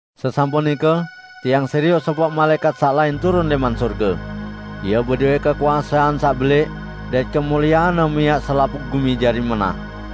Sesampun nike tiang serioq sopoq malaẽkat saq lain turun lẽman sorge. Ie bedowẽ kekuasean saq belẽq, dait kemulieanne miaq selapuq gumi jari menah.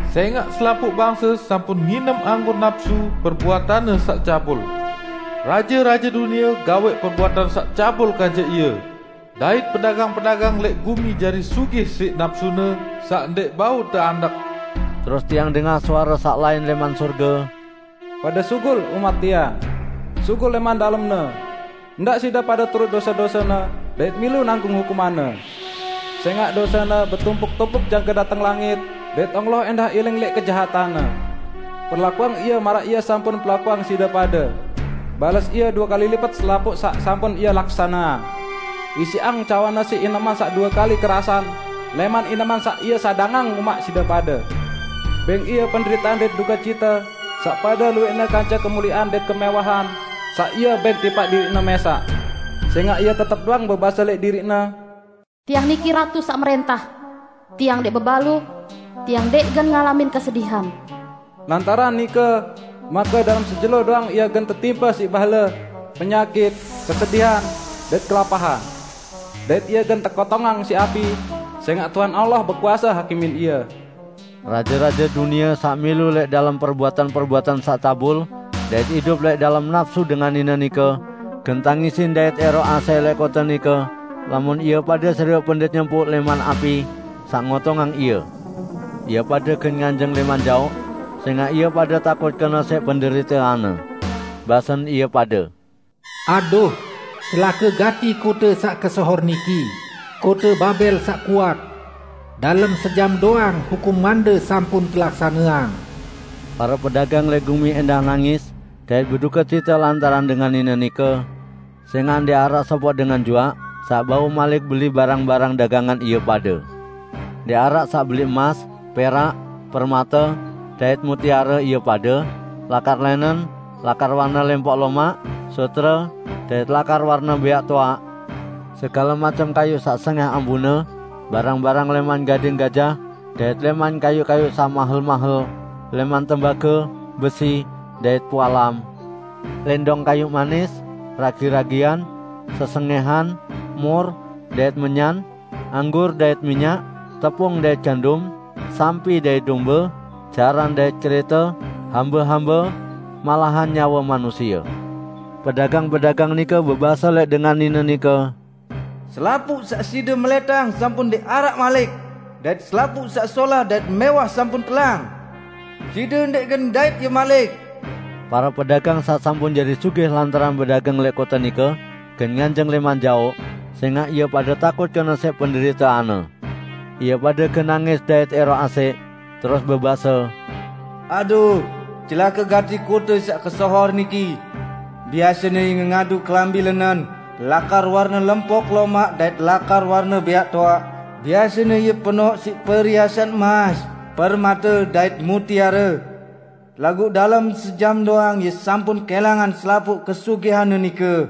Sẽngaq selapuq bangse sampun nginem anggur napsu perbuatanne saq cabul. Raje-raje dunie gawẽq perbuatan saq cabul kance ie, dait pedagang-pedagang lẽq gumi jari sugih siq napsune saq ndẽq bau teandek." Terus tiang dengah suare saq lain lẽman sorge, "Pade sugul, umat Tiang! Sugul lẽman dalemne! Ndaq side pade turut dose-dosene, dait milu nanggung hukumanne! Sẽngaq dosene betumpuk-tumpuk jangke dateng langit, dait Allah ẽndah iling lẽq kejahatanne. Perlakuang ie maraq ie sampun perlakuang side pade; bales ie due kali lipet selapuq saq sampun ie laksaneang. Isiqang cawanne siq ineman saq due kali kerasan lẽman ineman saq ie sadangang umaq side pade. Bẽng ie penderitean dait dukecite saq pade luwẽqne kance kemuliean dait kemẽwahan saq ie bẽng tipaq diriqne mẽsaq. Sẽngaq ie tetep doang bebase lẽq diriqne, 'Tiang niki ratu saq mrẽntah! Tiang ndẽq bebalu; tiang ndẽq gen ngalamin kesedihan!' Lantaran nike, make dalem sejelo doang ie gen tetimpe siq bahle -- penyakit, kesedihan, dait kelapahan. Dait ie gen tekotongang siq api, sẽngaq Tuhan Allah bekuase hakimin ie." Raje-raje dunie saq milu lẽq dalem perbuatan-perbuatan saq cabul dait idup lẽq dalem napsu dengan nine nike, gen tangisin dait ẽroq asẽq lẽq kote nike lamun ie pade serioq pendet nyempuq lẽman api saq ngotongang ie. Ie pade gen nganjeng lẽman jaoq sẽngaq ie pade takut kene siq penderiteanne. Basen ie pade, "Aduh, celake gati kote saq kesohor niki -- kote Babel saq kuat! Dalem sejam doang hukumande sampun telaksaneang!" Pare pedagang lẽq gumi ẽndah nangis dait bedukecite lantaran dengan nine nike, sẽngaq ndẽq araq sopoq dengan juaq saq bau malik beli barang-barang dagangan ie pade. Ndẽq araq saq beli emas, perak, permate, dait mutiare ie pade; lakar lẽnen, lakar warne lempok lomaq, sutre dait lakar warne bẽaq toaq; segale macem kayuq saq sengẽh ambune, barang-barang lẽman gading gajah dait lẽman kayuq-kayuq saq mahel-mahel, lẽman tembage, besi, dait pualam; lẽndong kayuq manis, ragi-ragian, sesengẽhan, mur, dait menyan; anggur dait minyak, tepung dait gandum; sampi dait dombe, jaran dait kerẽte, hambe-hambe, malahan nyawe manusie. Pedagang-pedagang nike bebase lẽq dengan nine nike, "Selapuq saq side melẽtang sampun ndẽq araq malik, dait selapuq saq solah dait mẽwah sampun telang. Side ndẽq gen ndait ie malik!" Pare pedagang saq sampun jari sugih lantaran bedagang lẽq kote nike gen nganjeng lẽman jaoq, sẽngaq ie pade takut kene siq penderiteanne. Ie pade gen nangis dait ẽroq asẽq, terus bebase, "Aduh, celake gati kote saq kesohor niki! Biasene ie ngengadu kelambi lẽnen, lakar warne lempok lomaq dait lakar warne bẽaq toaq; biasene ie penoq siq periasan emas, permate, dait mutiare! Laguq dalem sejam doang ie sampun kẽlangan selapuq kesugihanne nike!"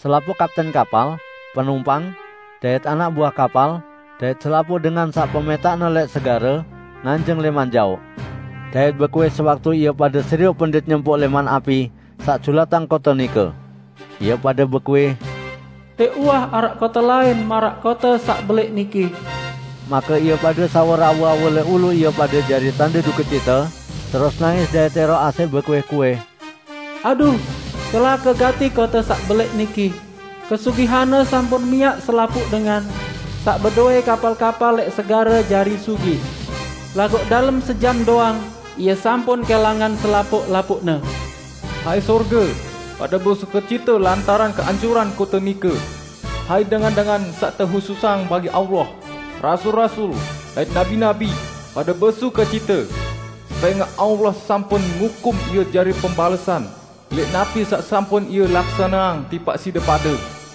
Selapuq kapten kapal, penumpang, dait anak buah kapal, dait selapuq dengan saq pemẽtaqne lẽq segare, nganjeng lẽman jaoq. Dait bekuih sewaktu ie pade serioq pendet nyempuq lẽman api saq julatang kote nike. Ie pade bekuih, "Ndẽq uwah araq kote lain maraq kote saq belẽq niki!" Make ie pade sawur awu-awu lẽq ulu ie pade jari tande dukecite, terus nangis dait ẽroq asẽq bekuih-kuih, "Aduh, celake gati kote saq belẽq niki! Kesugihanne sampun miaq selapuq dengan saq bedowẽ kapal-kapal lẽq segare jari sugih! Laguq dalem sejam doang, ie sampun kẽlangan selapuq-lapuqne!" Hai sorge, pade besukecite lantaran keancuran kote nike! Hai dengan-dengan saq tehususang bagi Allah, rasul-rasul, dait nabi-nabi, pade besukecite! Sẽngaq Allah sampun ngukum ie jari pembalesan lẽq napi saq sampun ie laksaneang tipaq side pade!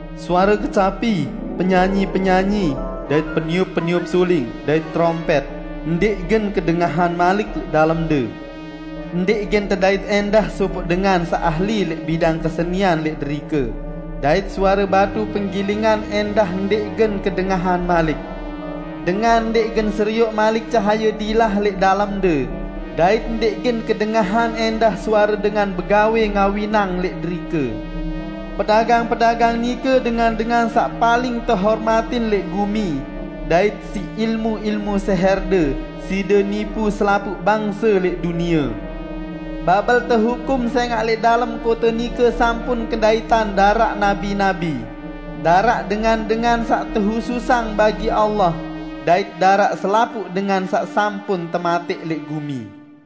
Suare kecapi, penyanyi-penyanyi, dait peniup-peniup suling dait terompẽt ndẽq gen kedengahan malik lẽq dalemde, ndẽq gen tedait ẽndah sopoq dengan saq ahli lẽq bidang kesenian lẽq derike, dait suare batu penggilingan ẽndah ndẽq gen kedengahan malik. Dengan ndẽq gen serioq malik cahaye dilah lẽq dalemde; dait ndẽq gen kedengahan ẽndah suare dengan begawẽ ngawinang lẽq derike. Pedagang-pedagang nike dengan-dengan saq paling tehormatin lẽq gumi, dait siq ilmu-ilmu sẽhẽrde side nipu selapuq bangse lẽq dunie!" Babel tehukum sẽngaq lẽq dalem kote nike sampun kendaitan daraq nabi-nabi, daraq dengan-dengan saq tehususang bagi Allah, dait daraq selapuq dengan saq sampun tematẽq lẽq gumi.